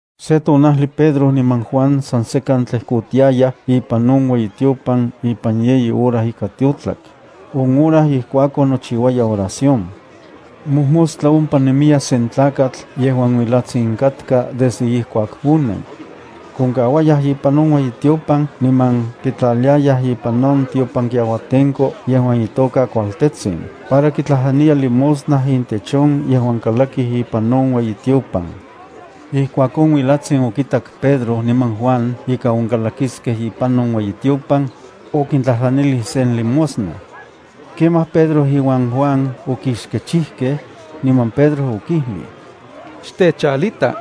Se tonajli Pedro niman Juan san sekan tlejkotiayaj ipan on ueyitiopan ipan yeyi hora ika tiotlak, on hora ijkuakon nochiuaya oración. Mojmostla ompa nemiya sen tlakatl yejuan uilatsin katka desde ijkuak onen. Konkauayaj ipan ueyitiopan niman kitlaliayaj ipan on tiopankiauatenko yejuan itoka “Kualtetsin” para kitlajtlaniya limosna intech on yejuan kalakij ipan on ueyitiopan. Ijkuak on uilatsin okitak Pedro niman Juan ika onkalakiskej ipan on ueyitiopan, okintlajtlanilij sen limosna. Kemaj Pedro iuan Juan okixkechijkej, niman Pedro okijlij: —Xtechalita.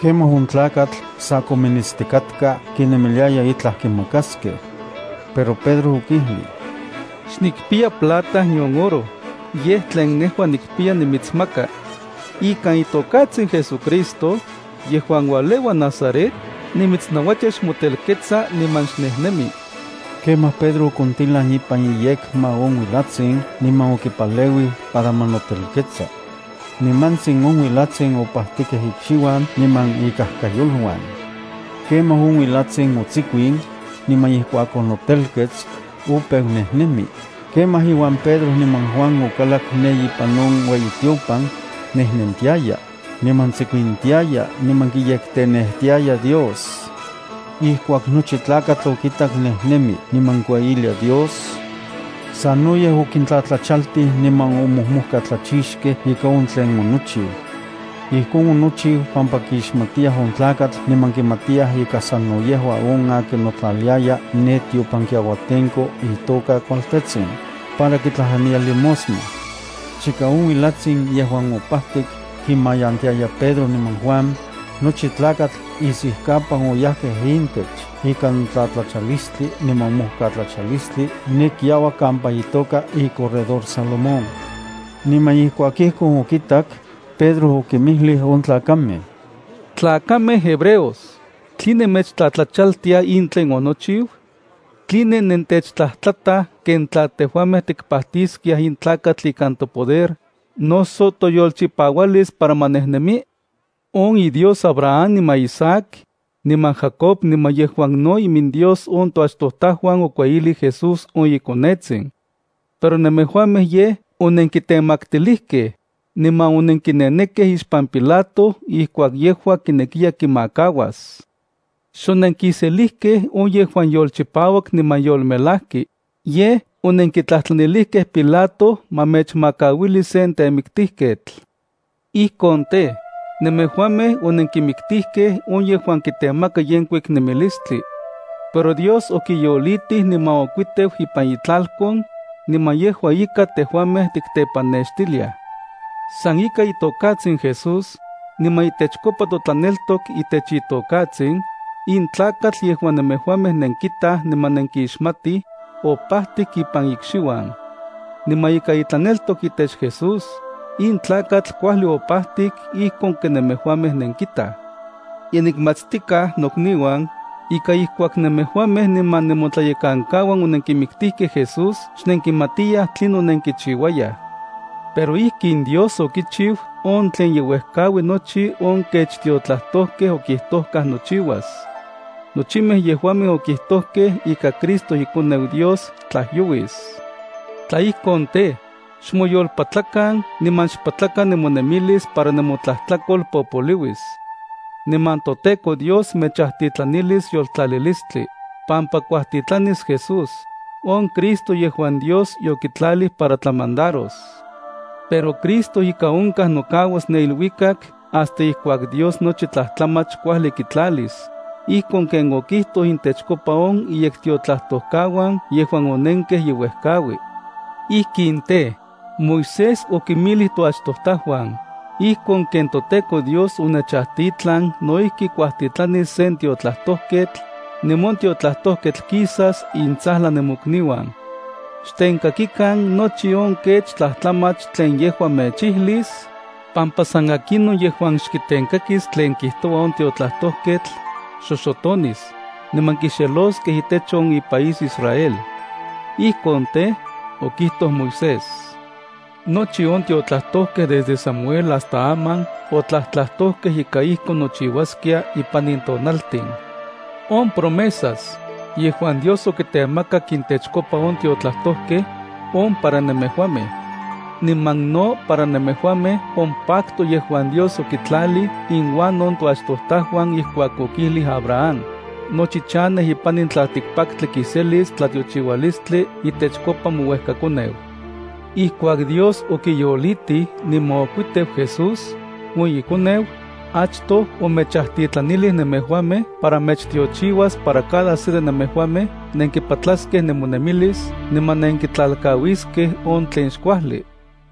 Kemaj on tlakatl sa kominitstikatka kinemiliaya itlaj kimakaskej. Pero Pedro okijlij: —Xnikpiya plata nion oro, yej tlen nejua nikpiya nimitsmaka. Ikan itokatsin JesuCristo, yejuan ualeua Nazaret, nimitsnauatia xmotelketsa niman xnejnemi. Kemaj Pedro okontilan ipan iyekma on uilatsin niman okipaleuij para ma notelketsa. Nimantsin on uilatsin opajtikej ikxiuan niman ikajkayoluan. Kemaj on uilatsin otsikuin, niman ijkuak onotelkets, opeu nejnemi. Kemaj inuan Pedro niman Juan okalak ne ipan on ueyitiopan, nejnentiaya, niman tsikuintiaya niman kiyektenejtiaya Dios. Ijkuak nochi tlakatl okitak nejnemi niman kueyilia Dios, sanoyej okintlatlachaltij niman omojmojkatlachixkej ika on tlen onochiu. Ijkon onochiu pampa kixmatiyaj on tlakatl niman kimatiyaj ika sano yejua on akin notlaliaya ne tiopankiauatenko itoka “Kualtetsin”, para kitlajtlaniya limosna. Chika on uilatsin yejuan opajtik kimayantiaya Pedro niman Juan, nochi tlakatl isijkapan oyajkej intech ikan tlatlachalistli niman mojkatlachalistli ne kiauak kampa itoka iCorredor Salomón. Niman ijkuak ijkon okitak, Pedro okinmijlij on tlakamej: —Tlakamej hebreos, ¿tline mechtlatlachaltia in tlen onochiu? ¿Tline nentechtlajtlataj ken tla tejuamej tikpajtiskiaj in tlakatl ikan topoder, noso toyolchipaualis para ma nejnemi? On iDios Abraham niman Isaac, niman Jacob niman yejuan no iminDios on toachtojtajuan okueyilij Jesús on iKonetsin. Pero nemejuamej yej onenkitemaktilijkej, niman onenkinenekej ixpan Pilato ijkuak yejua kinekiya kimakauas. Xonenkiselijkej on yejuan yolchipauak niman yolmelajki, yej onenkitlajtlanilijkej Pilato ma mechmakauili sen temiktijketl. Ijkon tej, nemejuamej onenkimiktijkej on yejuan kitemaka yenkuik nemilistli. Pero Dios okiyolitij niman okuiteu ipan itlalkon, niman yejua ika tejuamej tiktepanextiliaj. San ikan itokatsin Jesús, niman itechkopa totlaneltok itech itokatsin, in tlakatl yejuan nemejuamej nenkitaj niman nenkixmatij, opajtik ipan ikxiuan. Niman ika itlaneltok itech Jesús, in tlakatl kuajli opajtik ijkon ken nemejuamej nenkitaj. ’Ye nikmatstikaj, nokniuan, ika ijkuak nemejuamej niman nemotlayekankauan onenkimiktijkej Jesús xnenkimatiyaj tlinon nenkichiuayaj. Pero ijkin Dios okichiu on tlen ye uejkaui nochi on kech tiotlajtojkej okijtojkaj nochiuas. Nochimej yejuamej okijtojkej ika Cristo ikoneu Dios tlajyouis. Tla ijkon tej, xmoyolpatlakan niman xpatlakan nemonemilis para nemotlajtlakol popoliuis. Niman toTEKO Dios mechajtitlanilis yoltlalilistli, niman kuajtitlanis Jesús on Cristo yejuan Dios yokitlalij para tlamandaros. Pero Cristo ika onkaj nokauas ne iluikak hasta ijkuak Dios nochi tlajtlamach kuajli kitlalis, ijkon ken okijtoj intechkopa on iyektiotlajtojkauan yejuan onenkej ye uejkaui. Ijkin tej, Moisés okinmijlij toachtojtajuan: “Ijkon ken toTEKO Dios onechajtitlan no ijki kuajtitlanis sen tiotlajtojketl, niman on tiotlajtojketl kisas intsajlan nemokniuan. Xtenkakikan nochi on kech tlajtlamach tlen yejua mechijlis, pampa san akinon yejuan xkitenkakis tlen kijtoua on tiotlajtojketl, xoxotonis, niman kixeloskej itech on ipaís Israel.” Ijkon tej, okijtoj Moisés. Nochi on tiotlajtojkej desde Samuel hasta aman otlajtlajtojkej ika ijkon nochiuaskia ipan in tonaltin. On promesas, yejuan Dios okitemakak intechkopa on tiotlajtojkej, on para nemejuamej. Niman no para nemejuamej on pacto yejuan Dios okitlalij inuan on toachtojtajuan ijkuak okijlij Abraham: “Nochi chanej ipan in tlaltikpaktli kiselis tlatiochiualistli itechkopa mouejkakoneu.” Ijkuak Dios okiyolitij niman okuiteu Jesús, on iKoneu, achtoj omechajtitlanilij nemejuamej para mechtiochiuas para cada se de nemejuamej nenkipatlaskej nemonemilis niman nenkitlalkauiskej on tlen xkuajli.